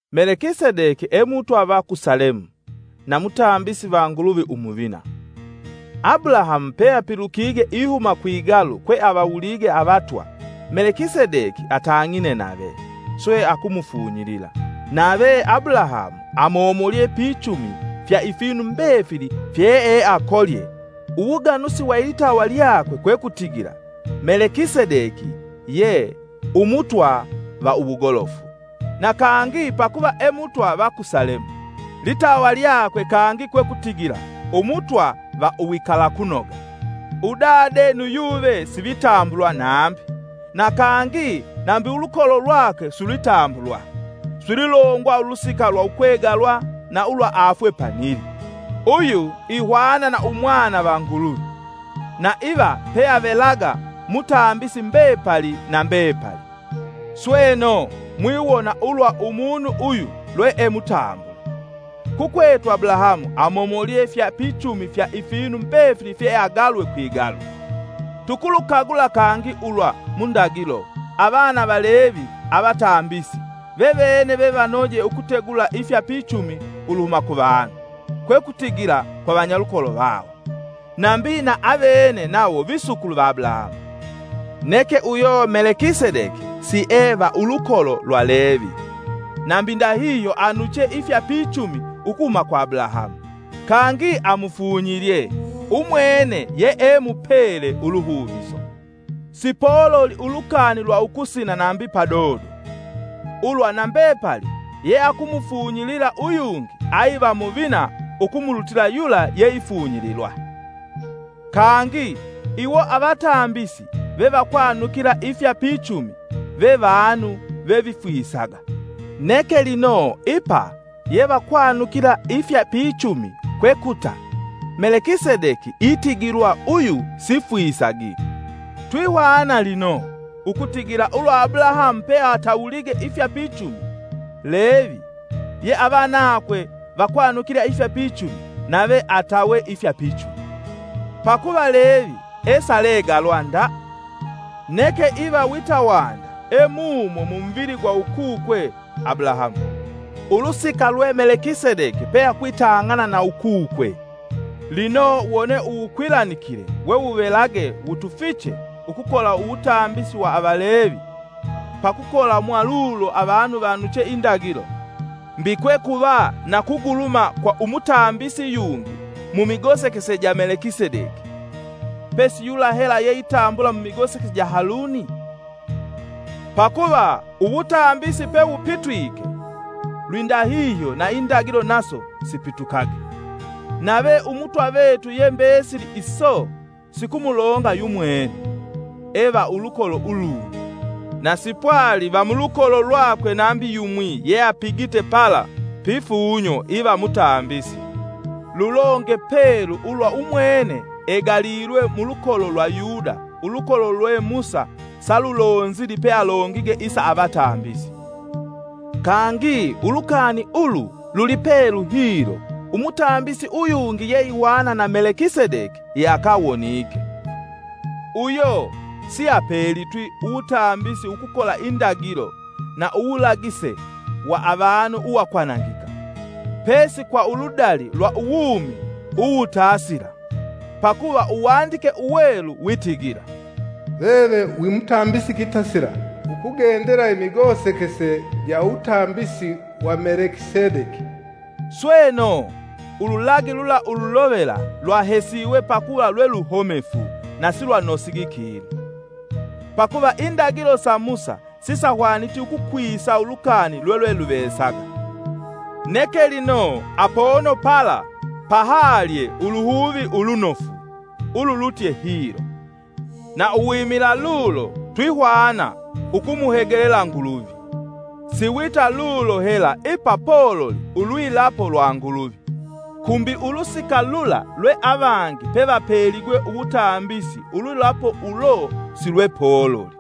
Melekisedeki e Mutwa va ku Salemu, na mutambisi va Nguluvi umuvina. Abulahamu peapilukige ihuma kwigalu kwe avawulige avatwa, Melekisedeki atang'ine nave, swe akumufunyilila, nave Abulahamu amomolye pichumi fya ifinu mbefili fyeeakolye uwuganusi wa ilitawa lyakwe Kwekutigila Melekisedeki ye, “Umutwa va uwugolofu”; na, kangi pakuva e Mutwa va ku Salemu, litawa lyakwe kangi kwekutigila, “Umutwa va uwikalakunoga.” Udade nu yuve sivitambulwa nambi, na kangi nambi ulukolo lwakwe silwitambulwa; silwilongwa ulusika lwa ukwegalwa na ulwa afwe panili. Uyu ihwana na Umwana va Nguluvi, na iva peavelaga mutambisi mbepali na mbepali. Sweno, mwiwona ulwa umunu uyu lwee mutambule. Kukwetu Abulahamu amomolye fya pichumi fya ifinu mbefili fyeeagalwe kwigalu. Tukulukagula kangi ulwa mu ndagilo, avana va Levi avatambisi, vevene vevanoje ukutegula ifya pichumi uluhuma kuvanu, kwe kutigila kwa vanyalukolo vawo, nambi na avene nawo visukulu va Abulahamu. Neke uyo Melekisedeki sie va ulukolo lwa Levi, nambi ndahihyo anuche ifya pichumi ukuhuma kwa Abulahamu; kangi amufunyilye umwene yee mupele uluhuviso. Sipololi ulukani lwa ukusina nambi padodo, ulwa na mbepali yeakumufunyilila uyungi aiva muvina ukumulutila yula yeifunyililwa. Kangi, iwo avatambisi vevakwanukila ifya pichumi, ve vanu ve vifwisaga; neke lino ipa yevakwanukila ifya pichumi kwekuta Melekisedeki itigilwa uyu sifwisagi. Twihwana lino, ukutigila ulwa Abulahamu peatawulige ifya pichumi, Levi (ye avanakwe vakwanukila ifya pichumi) nave atawe ifya pichumi. Pakuva Levi esalegalwa nda, neke iva wita wanda e mumo mumuvili gwa ukukwe Abulahamu, ulusika lwe Melekisedeki peakwitang'ana na ukukwe. Lino wone uwukwilanikile wewuvelage wutufiche ukukola uwutambisi wa Avalevi (pakukola mwalulo avanu vanuche indagilo), mbi kwekuva na kuguluma kwa umutambisi yungi se mumigosekese ja Melekisedeki, pesi yula hela yeitambula mumigosekese ja Haluni? Pakuva uwutambisi pewupitwike, lwindahihyo na indagilo naso sipitukage. Nave Umutwa vetu ye mbesili iso sikumulonga yu mwene, e va ulukolo ulungi, na sipwali va mulukolo lwakwe nambi yumwi yeapigite pala pifunyo iva mutambisi. Lulonge pelu ulwa umwene egalilwe mulukolo lwa Yuda ulukolo lwe Musa salulonzili pealongige isa avatambisi. Kangi ulukani ulu lulipelu hilo Umutambisi uyungi yeihwana na Melekisedeki yeakawonike. Uyo siapelitwi uwutambisi ukukola indagilo na uwulagise wa avanu uwakwanangika, pesi kwa uludali lwa uwumi uwutasila. Pakuva Uwandike Uwelu witigila, “Veve wi mutambisi kitasila, ukungendela imigosekese ja uwutambisi wa Melekisedeki.” Sweno, ululagi lula ululovela lwahesiwe pakuva lwe luhomefu na silwanosigi kinu. Pakuva indagilo sa Musa sisahwaniti ukukwisa ulukani lwelweluvesaga. Neke lino, apono pala pahalye uluhuvi ulunofu ululutye hilo, na uwimila lulo twihwana ukumuhegelela Nguluvi. Siwita lulo hela ipa pololi ulwilapo lwa Nguluvi. Kumbi ulusika lula lwe avangi pevapeligwe uwutambisi ulwilapo ulo silwepololi.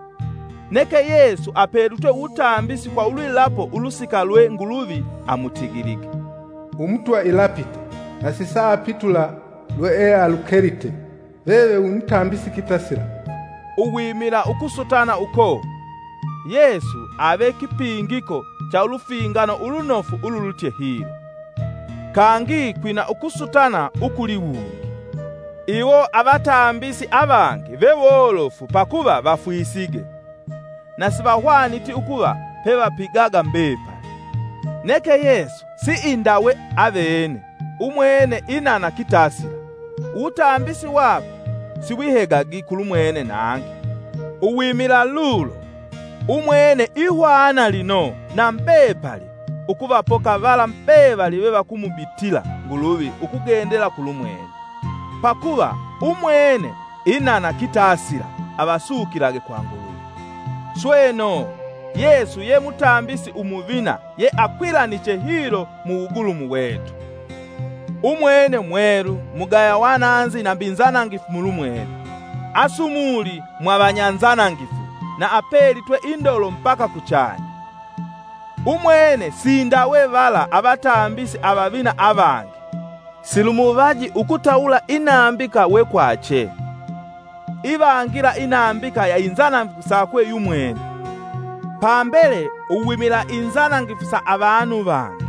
Neke Yesu apelitwe uwutambisi kwa ulwilapo ulusika lwe Nguluvi amutigilige: “Umutwa ilapite, na sisaapitula lweealulekite: ‘Veve wi mutambisi kitasila.’” Uwimila ukusutana uko, Yesu ave kipingiko cha ulufingano ulunofu ululutye hilo. Kangi kwina ukusutana ukuliwungi; iwo avatambisi avangi vewolofu pakuva vafwisige na sivahwaniti ukuva pevapigaga mbepali. Neke Yesu siindawe avene, umwene inana kitasila, uwutambisi wakwe siwihegagi kulumwene nangi. Uwimila lulo, umwene ihwana lino na mbepali ukuvapoka vala mbevali vevakumubitila Nguluvi ukugendela kulumwene, pakuva umwene inana kitasila avasukilage kwa Nguluvi. Sweno, Yesu ye mutambisi umuvina yeakwilaniche hilo mu wugulumu wetu. Umwene mwelu, mugaya wananzi nambi nzanangifu mulumwene; asumuli mwa vanyanzanangifu na apelitwe indolo mbaka kuchanya. Umwene siindawe vala avatambisi avavina avangi; silumuvaji ukutawula inambika wekwache, ivangila inambika ya inzanangifu sakwe yumwene, pambele uwimila inzanangifu sa avanu vangi.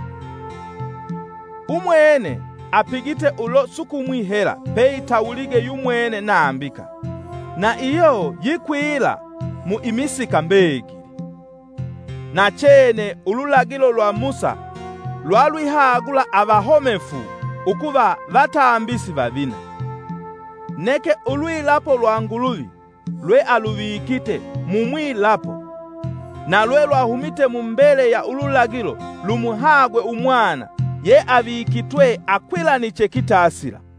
Umwene apigite ulo sukumwi hela peitawulige yumwene nambika, na iyo yikwila mu imisika mbegili. Nachene ululagilo lwa Musa lwalwihagula avahomefu ukuva vatambisi vavina; neke ulwilapo lwa Nguluvi lwealuvikite mu mwilapo na lwelwahumite mu mbele ya ululagilo lumuhagwe Umwana yeavikitwe akwilaniche kitasila.